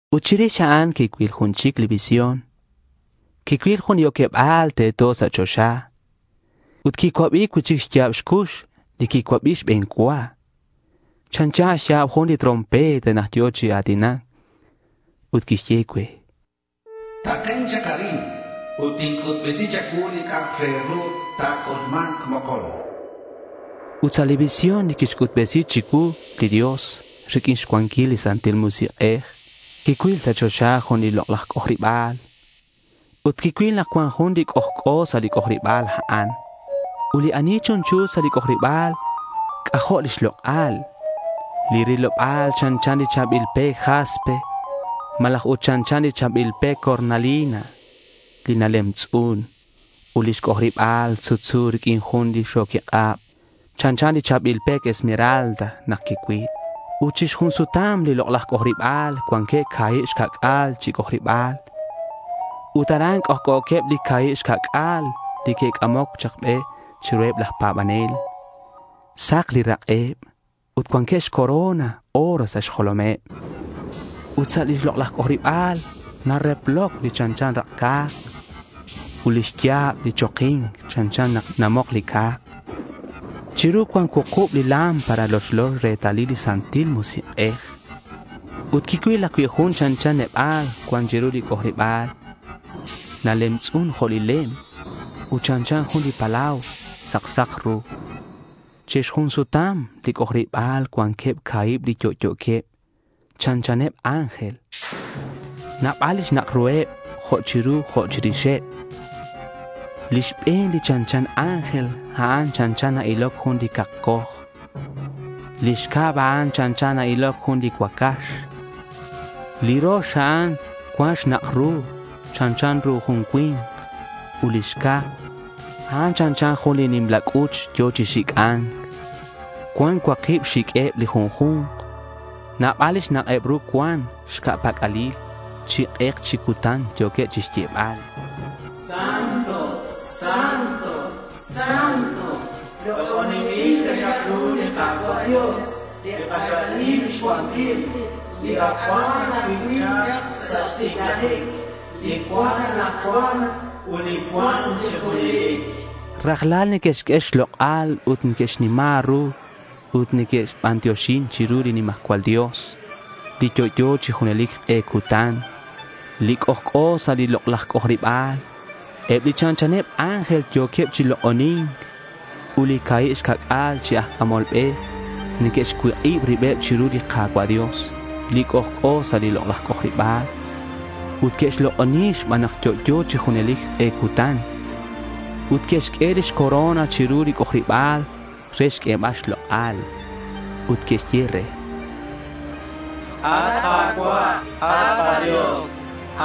Ut chirix a'an quicuil jun chic li visión. Quicuil jun li oqueba̱l teto sa' choxa. Ut quicuabi cui'chic li xya̱b li cux li quicuabi xbe̱n cua, chanchan xya̱b jun li trompeta nak yo̱ chi a̱tinac, ut quixye cue: —Taken chak arin ut tinc'utbesi cha̱cuu li c'a'ak re ru ta̱c'ulma̱nk mokon, chan. Ut sa' li visión li quixc'utbesi chicuu li Dios riq'uin xcuanquil li Santil Musik'ej, quicuil sa' choxa jun li lok'laj c'ojariba̱l. Ut quicuil nak cuan jun c'ojc'o sa' li c'ojariba̱l a'an. Ut li ani chunchu sa' li c'ojariba̱l, c'ajo' lix lok'al. Li riloba̱l chanchan li cha̱bil pec jaspe malaj ut chanchan li cha̱bil pec cornalina li nalemtz'un. Ut lix c'ojariba̱l sutsu riq'uin jun li xo̱quik'ab chanchan li cha̱bil pec esmeralda nak quicuil. Ut chi xjun sutam li lok'laj c'ojariba̱l cuanqueb ca̱hib xca'c'a̱l chic li c'ojariba̱l. Ut aran c'ojc'o̱queb li ca̱hib xca'c'a̱l li que'c'amoc chak be chiruheb laj pa̱banel. Sak li rak'eb ut cuanqueb xcorona oro sa' xjolomeb. Ut sa' li lok'laj c'ojariba̱l nareploc li chanchan rak' ca̱k ut lix ya̱b li choki̱nc chanchan nak namok li ca̱k. Chiru cuan cuukub li lámpara lochlo retalil li Santil Musik'ej. Ut quicuil ajcui' jun chanchan neba̱l cuan chiru li c'ojariba̱l. Nalemtz'un jo' li lem ut chanchan jun li palau sak sak ru. Chi xjun sutam li c'ojariba̱l cuanqueb ca̱hib li yo'yo̱queb, chanchaneb ángel. Nabal li xnak' ruheb, jo' chiru jo' chirixeb. Li xbe̱n li chanchan ángel, a'an chanchan na-iloc jun li cakcoj; li xcab, a'an chanchan na-iloc jun li cuacax; li rox, a'an cuan xnak' ru chanchan ru jun cui̱nk; ut li xca̱, a'an chanchan jun li nimla c'uch yo̱ chi xic'a̱nc. Cuan cuakitk xiq'ueb li junju̱nk. Nabal li xnak'eb ru cuan xca' pac'alil. Chi k'ek chi cutan yo̱queb chixyebal: —Santo, santo, santo. Lok'oninbil taxak ru li Ka̱cua' Dios li k'axal nim xcuanquil, li ac cuan ajcui' chak sa' xticlajic, li cuan anakcuan ut li cua̱nk chi junelic. Rajlal neque'xq'ue xlok'al ut neque'xnima ru ut neque'xbantioxi chiru li nimajcual Dios, li yo'yo chi junelic k'e cutan, li c'ojc'o sa' lix lok'laj c'ojariba̱l. Eb li chanchaneb ángel yo̱queb chi lok'oni̱nc, ut li ca̱hib xca'c'a̱l chi aj c'amol be neque'xcuik'ib ribeb chiru li Ka̱cua' Dios, li c'ojc'o sa' lix c'ojariba̱l ut que'xlok'oni xban nak yo'yo chi junelic k'e cutan ut que'xq'ue lix corona chiru lix c'ojariba̱l re xq'uebal xlok'al. Ut que'xye re: At Ka̱cua', at kaDios,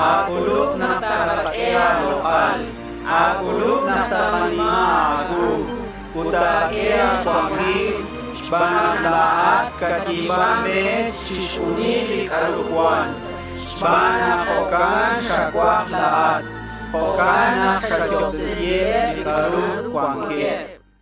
a̱c'ulub nak takaq'ue a̱lok'al. A̱c'ulub nak ta̱nima̱k a̱cuu ut ta̱q'uehek' a̱cuanquil xban nak la̱at catyi̱ban re chixjunil li c'a'ru cuan. Xban nak jo'can xacuaj la̱at, jo'can nak xayo'obtesiheb li c'a'ru cuanqueb.